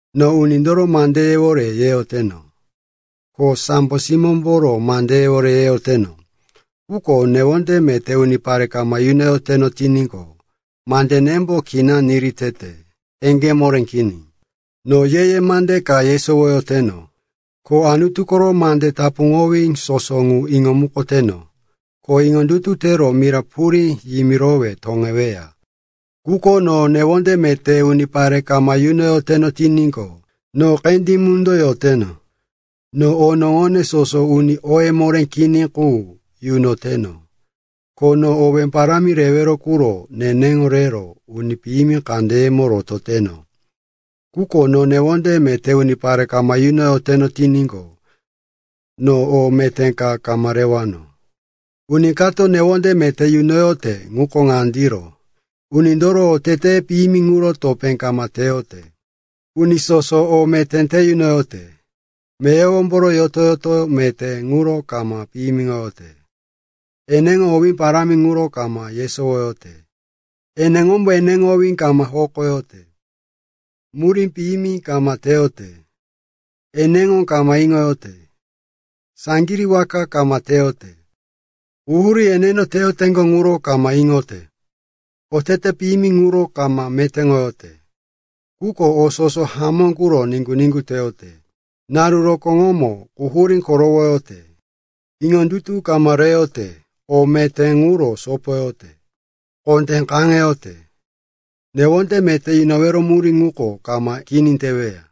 No unindoro mandeyewore yeyoteno, ko sambo simómboro mandeyewore yeyoteno, quko newonde meté unipare kama yunoyoteno tiníqo, mandenembo kina niri tete, eŋgé moré kini. No ye-ye mande ka yesowoyoteno, ko Anutu koro mande tapuŋowí soso ŋu iŋomukoteno, ko iŋondutu tero mira purí yimirowe toŋeweya, quko no newonde meté unipare kama yunoyoteno tiníqo, no qendí mundo yoteno. No onoŋone soso uni oye moré kini qu yunoteno, ko no owé parámi rewero quro neneŋo rero uni piyimi kandeyemo norototeno, quko no newonde meté unipare kama yunoyoteno tiníqo, no o meté ka kama rewano. Uni kato newonde meté yunoyote ŋuko ŋandiro: unindoro oteteye piyimi ŋuro topé kama teyote. Uni soso o meté te yunoyote. Meyowomboro yoto-yoto meté ŋuro kama piyimiŋoyote. Eneŋo owí parámi ŋuro kama yesowoyote. Eneŋombo eneŋo owí kama hokoyote. Murí piyimi kama teyote. Eneŋo kama iŋoyote. Saŋgirí waka kama teyote. Quhurí eneno teyoteŋgo ŋuro kama iŋoyote. Otete piyimi ŋuro kama metéŋoyote, quko o soso hamó quro niŋgu-niŋgu teyote. Naru rokóŋomo quhurí korowoyote, iŋondutu kama rotoyote, o meté ŋuro sopoyote, kondé kaŋeyote. Newonde meté yunowero murí ŋuko kama kini teweya.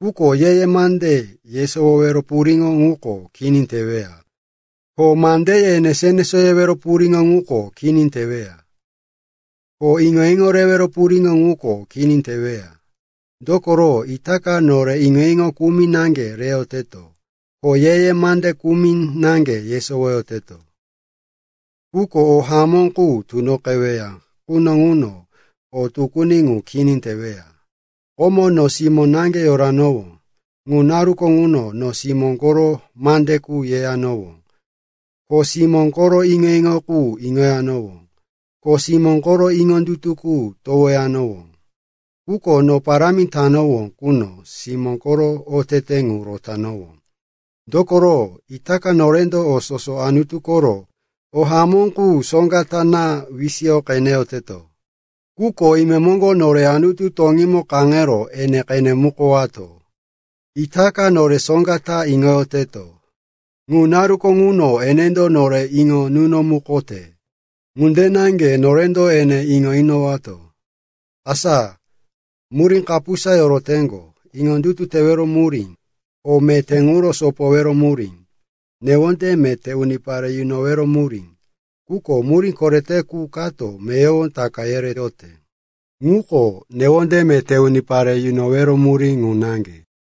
Quko ye-ye mande yesowowero puriŋo ŋuko kini teweya. Ko mandeye enesó-enesó yewero puriŋo ŋuko kini teweya. Ko iŋo-iŋo rewero puriŋo ŋuko kini teweya. Dokoro itaka nore iŋo-iŋo kumi naŋge reyoteto. Ko ye-ye mande kumi naŋge yesowoyoteto. Quko o hamó qu tunoqeweya quno ŋuno o tukuni ŋu kini teweya. Komo, no simó naŋge yoranowó. Ŋu naruko ŋuno, no simó koro mande qu yeyanowó, ko simó koro iŋo-iŋo qu iŋoyanowó, ko simó koro iŋondutu qu towoyanowó. Quko no parámi tanowó quno, simó koro otete ŋu rotanowó. Dokoro itaka norendo o soso Anutu koro o hamó qu soŋga ta naŋge wisiyo qeneyoteto. Quko imemoŋgo nore Anutu toŋímo kaŋero ene qenemukowato. Itaka nore soŋga ta iŋoyoteto. Ŋu naruko ŋuno, enendo nore iŋo nunomukote ŋunde naŋge norendo ene iŋo inowato. Asa murí kapusa yoroteŋgo: iŋondutu tewero murí, o meté ŋuro sopowero murí, newonde meté unipare yunowero murí. Quko murí korete qu kato meyowo taka yereyote, ŋuko newonde meté unipare yunowero murí ŋu naŋge.